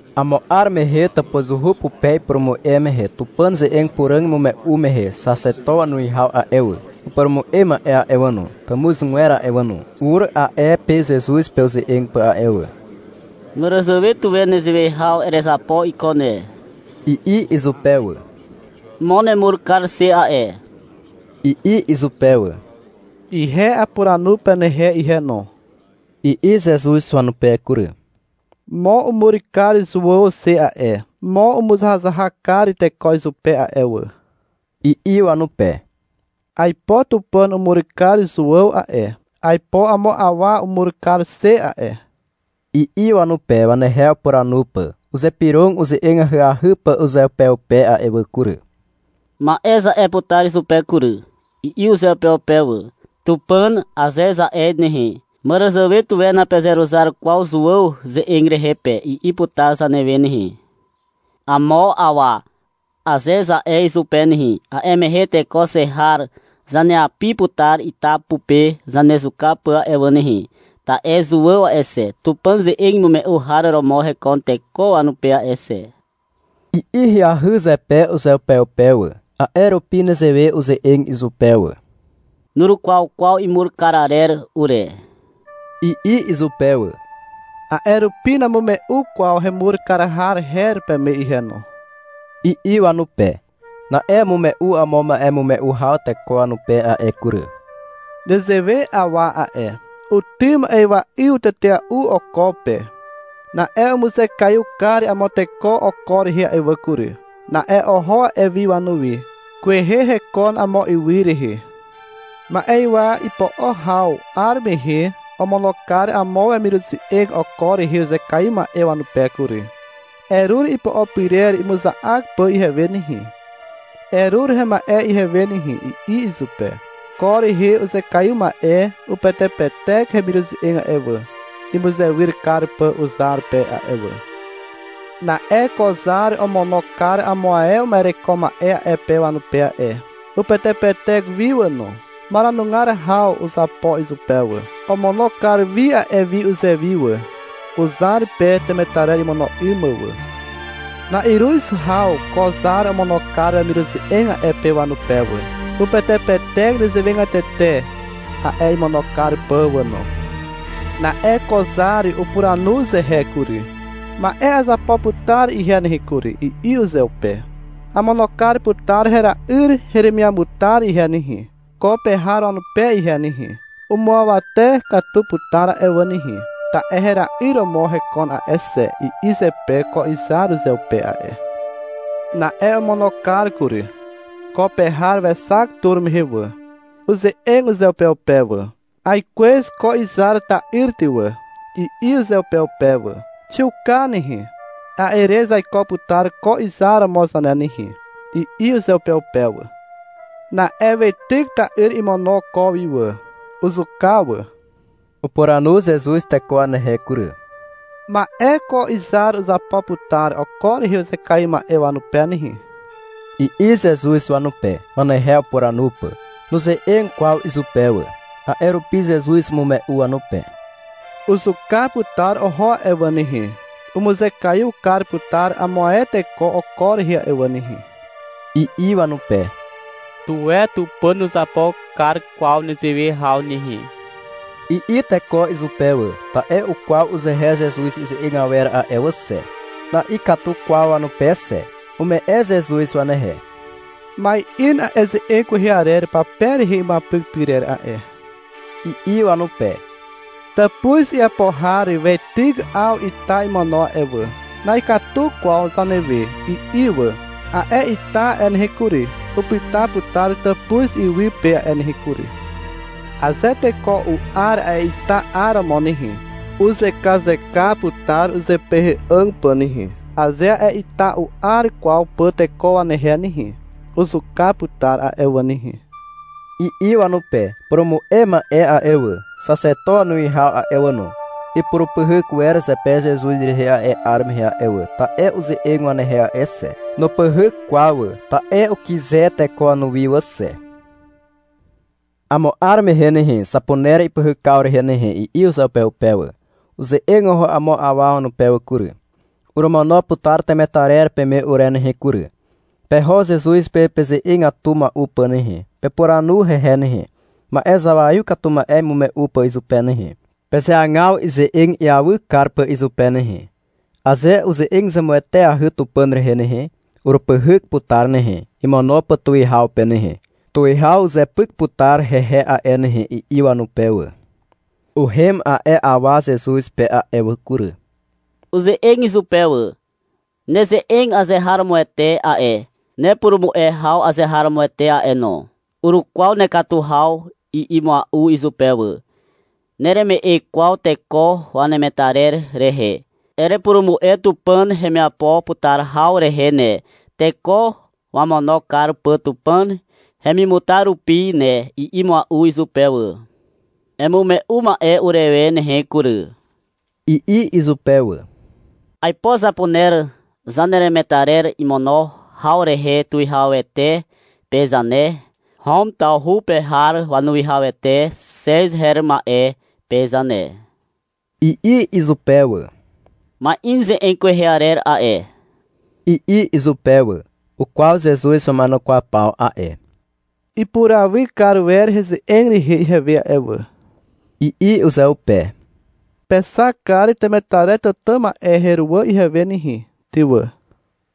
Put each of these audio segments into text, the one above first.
Amo 'ar mehe tàpuzuhu pupe ipurumu'e mehe Tupàn ze'eg puràg imume'u mehe xaxeto wanuwihaw a'e wà, upurumu'e ma'e a'e wà no, tàmuzgwer a'e wà no, ur a'e pe Zezuz pe uze'eg pà a'e wà. — Màràzàwe tuwe nezewe haw erezapo iko ne, i'i izupe wà. — Mo nemur kar xe a'e, i'i izupe wà. — Ihe apuranu penehe ihe no, i'i Zezuz wanupe kury. — Mo umur kar Zuàw xe a'e, mo umuzahazahak kar teko izupe a'e wà, i'i wanupe. — Aipo Tupàn umur kar Zuàw a'e. Aipo amo awa umur kar xe a'e, i'i wanupe, wanehe upuranu pà. Uzypyrog uze'eg ahyahy pà uzeupeupe a'e wà kury. — Ma'e za'e putar izupe kury, i'i uzeupeupe wà. — Tupàn, aze za'e nehe, — Màràzàwe tuwe napezeruzar kwaw Zuàw ze'eg rehe pe, i'i putar zanewe nehe. — Amo awa, aze za'e izupe nehe, a'e mehe teko xe har zaneapi putar ita pupe zanezuka pà a'e wà nehe, ta'e Zuàw a'e xe, Tupàn ze'eg imume'u har romo hekon teko wanupe a'e xe, i'i ahyahy zepe uzeupeupe wà. A'e rupi nezewe uze'eg izupe wà. — Nurukwaw kwaw imur kar arer ure, i'i izupe wà. — A'e rupi namume'u kwaw hemur kar har her peme ihe no, i'i wanupe. Na'e umume'u amo ma'emume'u haw teko wanupe a'e kury. — Nezewe awa a'e, utym ma'ywa'yw tetea'u oko pe. Na'e umuzekaiw kar amo teko oko rehe a'e wà kury. Na'e oho a'e wi wanuwi. Kwehe hekon amo ywy rehe. Ma'ywa ipo'o haw 'ar mehe omono kar amo wemiruze'eg oko rehe uzekaiw ma'e wanupe kury. — Erur ipo'o pyrer imuza'ak pà ihewe nehe, erur hema'e ihewe nehe, i'i izupe. Ko rehe uzekaiw ma'e upetepetek hemiruze'eg a'e wà, imuzewyr kar pà uzar pe a'e wà. Na'e ko zar omono kar amo ae uma'ereko ma'e a'e pe wanupe a'e. Upetepetek wi wà no. Maranugar haw uzapo izupe wà. Omono kar wi a'e wi uzewi wà, uzar pe temetarer imono 'ym mà wà. Na'iruz haw ko zar omono kar wemiruze'eg a'e pe wanupe wà. Upetepetek nezewegatete a'e imono kar pà wà no. Na'e ko zar upuranu uzehe kury. — Ma'e azapo putar ihe nehe kury, i'i uzeupe. Amono kar putar hera'yr heremiamutar ihe nehe, ko pe har wanupe ihe nehe. Umuawate katu putar a'e wà nehe, ta'e hera'yr romo hekon a'e xe, i'i zepe ko izar uzeupe a'e. Na'e omono kar kury. Ko pe har wexak tur mehe wà. Uze'eg uzeupeupe wà. — Aikwez ko izar ta'yr ty wà, i'i uzeupeupe wà. — Xiuka nehe, a'e re zaiko putar ko izar romo zane nehe, i'i uzeupeupe wà. Na'e weityk ta'yr imono ko wi wà. Uzuka wà. Upuranu Zezuz teko wanehe kury. — Ma'e ko izar uzapo putar oko rehe uzekaiw ma'e wanupe nehe, i'i Zezuz wanupe, wanehe upuranu pà. (Nuze'eg kwaw izupe wà. A'e rupi Zezuz umume'u wanupe.) — Uzuka putar oho a'e wà nehe, umuzekaiw kar putar amo ae teko oko rehe a'e wà nehe, i'i wanupe. — Tuwe Tupàn nuzapo kar kwaw nezewe haw nehe, i'i teko izupe wà. (Ta'e ukwaw uzehe Zezuz ize'eg awer a'e wà xe. Na'ikatu kwaw wanupe xe.) Ume'e Zezuz wanehe. Ma'in a'e ze'eg kwehe arer pape rehe imuapyk pyrer a'e, i'i wanupe. Tàpuz iapo har weityk 'aw ita imono a'e wà. — Na'ikatu kwaw zanewe, i'i wà. A'e ita a'e nehe kury, upyta putar tàpuz iwy pe a'e nehe kury. Aze teko u'ar a'e ita 'aromo nehe, uzekazeka putar uzepehe'àg pà nehe. Aze a'e ita u'ar kwaw pà teko wanehe nehe, uzuka putar a'e wà nehe, i'i wanupe. Upurumu'e ma'e a'e wà, xaxeto wanuwihaw a'e wà no, ipurupyhyk wer zepe Zezuz rehe a'e 'ar mehe we a'e wà, ta'e uze'eg wanehe a'e xe. Nupyhyk kwaw wà, ta'e ukyze teko wanuwi wà xe. — Amo 'ar mehe nehe, zapuner ipyhykaw rehe nehe, i'i uzeupeupe wà. Uze'eg oho amo awa wanupe wà kury. — Oromono putar temetarer peme ure nehe kury. Peho Zezuz pe peze'egatu mua'u pà nehe. Pepuranu hehe nehe, ma'e zawaiw katu ma'e imume'u pà izupe nehe. Pezeagaw ize'eg iawy kar pà izupe nehe. Aze uze'eg zemueteahy Tupàn rehe nehe, urupyhyk putar nehe, imono pà tuwihaw pe nehe. Tuwihaw uzepyk putar hehe a'e nehe, i'i wanupe wà. Uhem a'e awa Zezuz pe a'e wà kury. Uze'eg izupe wà. — Neze'eg azeharomoete a'e, nepurumu'e haw azeharomoete a'e no. Urukwaw nekatu haw, i'i mua'u izupe wà. — Nereme'e kwaw teko wanemetarer rehe. Erepurumu'e Tupàn hemiapo putar haw rehe ne, teko wamono kar pà Tupàn hemimutar rupi ne, i'i mua'u izupe wà. — Emume'u ma'e urewe nehe kury, i'i izupe wà. — Aipo zapuner zaneremetarer imono haw rehe tuwihawete pe zane, Hom tawhu pe har wanuwihawete Xez her ma'e pe zane, i'i izupe wà. — Ma'in ze'eg kwehe arer a'e, i'i izupe wà. Ukwaw Zezuz wama'enukwaw paw a'e. — Ipurawy kar wer heze'eg rehe ihewe a'e wà, i'i uzeupe. — Pexak kar temetarer tàtà ma'e heruwà ihewe nehe, ty wà,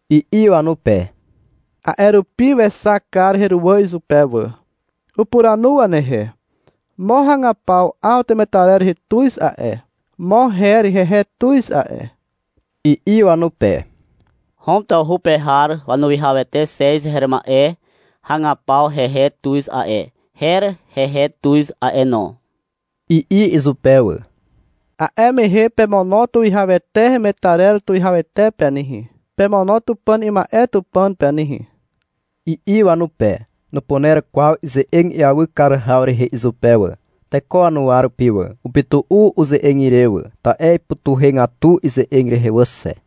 i'i wanupe. A'e rupi wexak kar heruwà izupe wà. Upuranu wanehe. — Mo hagapaw 'aw temetarer rehe tuz a'e, mo her hehe tuz a'e, i'i wanupe. — Hom tawhu pe har wanuwihawete Xez her ma'e hagapaw hehe tuz a'e, her hehe tuz a'e no, i'i izupe wà. — A'e mehe pemono tuwihawete hemetarer tuwihawete pe nehe. Pemono Tupàn ima'e Tupàn pe nehe, i'i wanupe. Nupuner kwaw ize'eg iawy kar haw rehe izupe wà, teko wanuwa rupi wà. Upytu'u uze'eg ire wà, ta'e ipytuhegatu ize'eg rehe wà xe.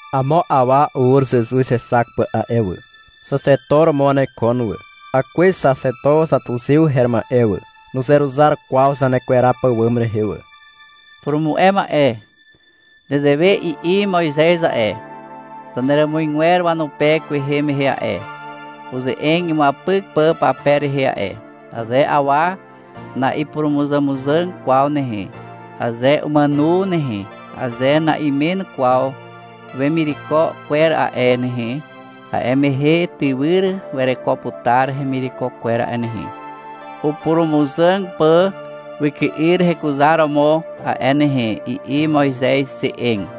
Amo awa ur Zezuz hexak pà a'e wà. Xaxeto romo wanekon wà. (Akwez xaxeto xatuxew her ma'e wà, nuzeruzar kwaw zanekweraw pàwàm rehe wà.) — Purumu'e ma'e. Nezewe i'i Moizez a'e, zaneràmuzgwer wanupe kwehe mehe a'e, uze'eg imuapyk pà pape rehe a'e. — Aze awa na'ipurumuzàmuzàg kwaw nehe, aze umàno nehe, aze na'imen kwaw wemireko kwer a'e nehe, a'e mehe tywyr wereko putar hemireko kwer a'e nehe, upurumuzàg pà wyky'yr rekuzar romo a'e nehe, i'i Moizez ze'eg.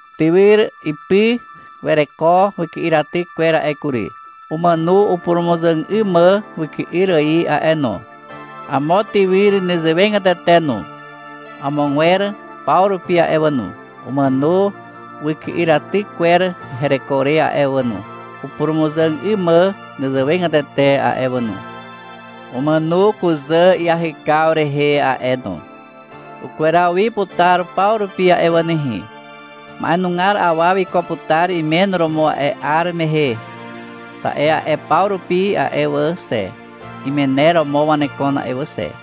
Tywyr ipy wereko wyky'yraty kwer a'e kury. Umàno upurumuzàg 'ym mà wyky'yr ài a'e no. Amo tywyr nezewegatete no. Amogwer paw rupi a'e wà no, umàno wyky'yraty kwer hereko re a'e wà no, upurumuzàg 'ym mà nezewegatete a'e wà no. Umàno kuzà iahykaw rehe a'e no. Ukweraw wi putar paw rupi a'e wà nehe. Ma'enugar awa wiko putar imen romo a'e 'ar mehe, ta'e a'e paw rupi a'e wà xe, imener romo wanekon a'e wà xe.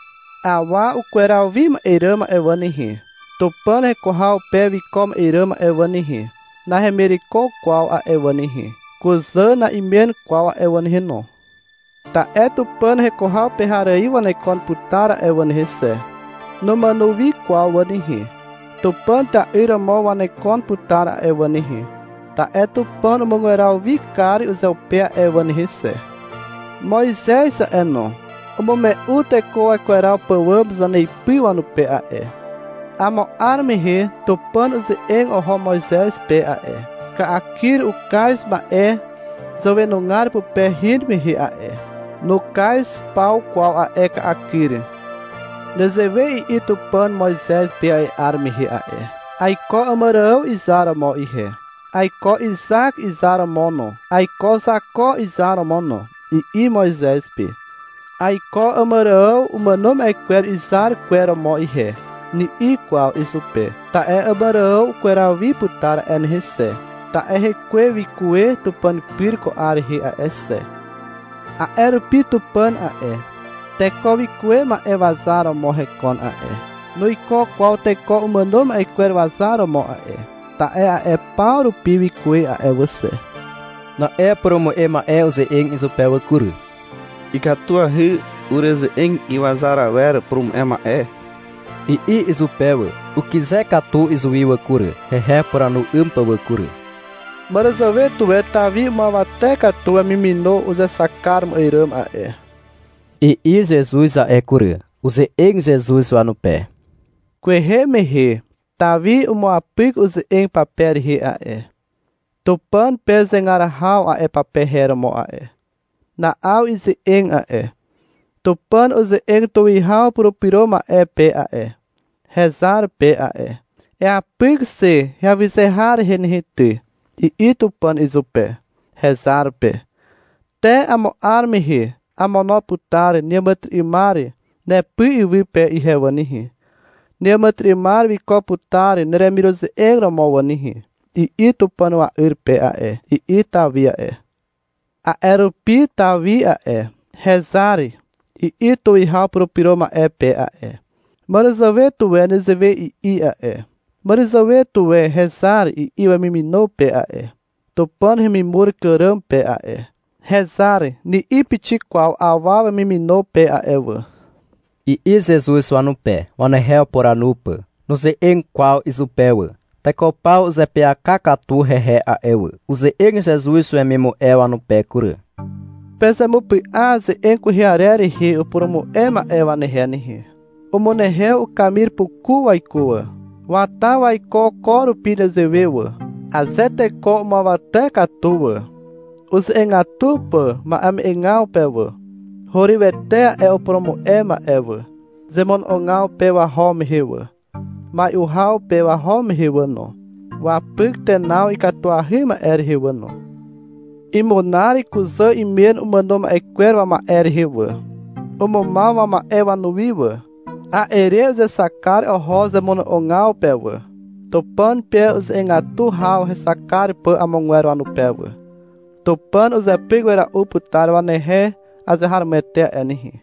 Awa ukweraw wi ma'e ràm a'e wà nehe, Tupàn heko haw pe wiko ma'e ràm a'e wà nehe, nahemireko kwaw a'e wà nehe. Kuzà na'imen kwaw a'e wà nehe no. Ta'e Tupàn heko haw pe har ài wanekon putar a'e wà nehe xe. Numàno wi kwaw wà nehe. Tupàn ta'yr romo wanekon putar a'e wà nehe, ta'e Tupàn umugweraw wi kar uzeupe a'e wà nehe xe. Moizez a'e no, umume'u teko wakweraw pàwàm zaneipy wanupe a'e. Amo 'ar mehe Tupàn uze'eg oho Moizez pe a'e, ka'akyr ukaz ma'e zàwenugar pupe hin mehe a'e. Nukaz paw kwaw a'e ka'akyr. Nezewe i'i Tupàn Moizez pe a'e 'ar mehe a'e. — Aiko Àmàrààw izar romo ihe, aiko Izak izar romo no, aiko Zako izar romo no, i'i Moizez pe. — Aiko Àmàrààw umàno ma'e kwer izar kwer romo ihe, ni'i kwaw izupe. (Ta'e Àmàrààw ukweraw wi putar a'e nehe xe, ta'e hekwe wikuwe Tupàn pyr ko 'ar rehe a'e xe.) A'e rupi Tupàn a'e, teko wikuwe ma'e wazar romo hekon a'e, nuiko kwaw teko umàno ma'e kwer wazar romo a'e. Ta'e a'e paw rupi wikuwe a'e wà xe. Na'e upurumu'e ma'e uze'eg izupe wà kury. — Ikatuahy ureze'eg iwazar awer, purumu'e ma'e, i'i izupe wà. Ukyze katu izuwi wà kury, hehe upuranu 'ym pà wà kury. — Màràzàwe tuwe Tawi umuawate katu wemimono uzexak kar ma'e ràm a'e, i'i Zezuz a'e kury. Uze'eg Zezuz wanupe. — Kwehe mehe Tawi umuapyk uze'eg pape rehe a'e, Tupàn pe zegar haw a'e pape her romo a'e. Na'aw ize'eg a'e. Tupàn uze'eg tuwihaw Purupyro Ma'e pe a'e, hezar pe a'e. — Eapyk xe heawyze har rehe nehe ty, i'i Tupàn izupe, hezar pe. — Te amo 'ar mehe amono putar neàmàtyry'ymar nepy iwy pe ihe wà nehe. Neàmàtyry'ymar wiko putar neremiruze'eg romo wà nehe, i'i Tupàn wa'yr pe a'e, i'i Tawi a'e. A'e rupi Tawi a'e, — Hezar, i'i tuwihaw Purupyro Ma'e pe a'e. Màràzàwe tuwe nezewe i'i a'e. Màràzàwe tuwe — Hezar, i'i wemimino pe a'e, Tupàn hemimur kàràm pe a'e. — Hezar, ni'i pixik kwaw awa wemimino pe a'e wà, i'i Zezuz wanupe, wanehe upuranu pà. (Nuze'eg kwaw izupe wà.) Teko paw uzeapyaka katu hehe a'e wà. Uze'eg Zezuz wemimu'e wanupe kury. — Pezemupy'a ze'eg kwehe arer rehe upurumu'e ma'e wanehe nehe. Umunehew ukamir puku waiko wà. Wata waiko ko rupi nezewe wà. Aze teko umuawate katu wà, uze'egatu pà ma'eme'egaw pe wà, hurywete a'e upurumu'e ma'e wà. Zemono'ogaw pe waho mehe wà, mai'u haw pe waho mehe wà no, wapyk tenaw ikatuahy ma'e rehe wà no. Imunar kuzà imen umàno ma'e kwer wama'e rehe wà. Umumaw wama'e wanuwi wà. A'e re uzexak kar oho zemono'ogaw pe wà, Tupàn pe uze'egatu haw hexak kar pà amogwer wanupe wà. Tupàn uzepyk wera'u putar wanehe azeharomoete a'e nehe.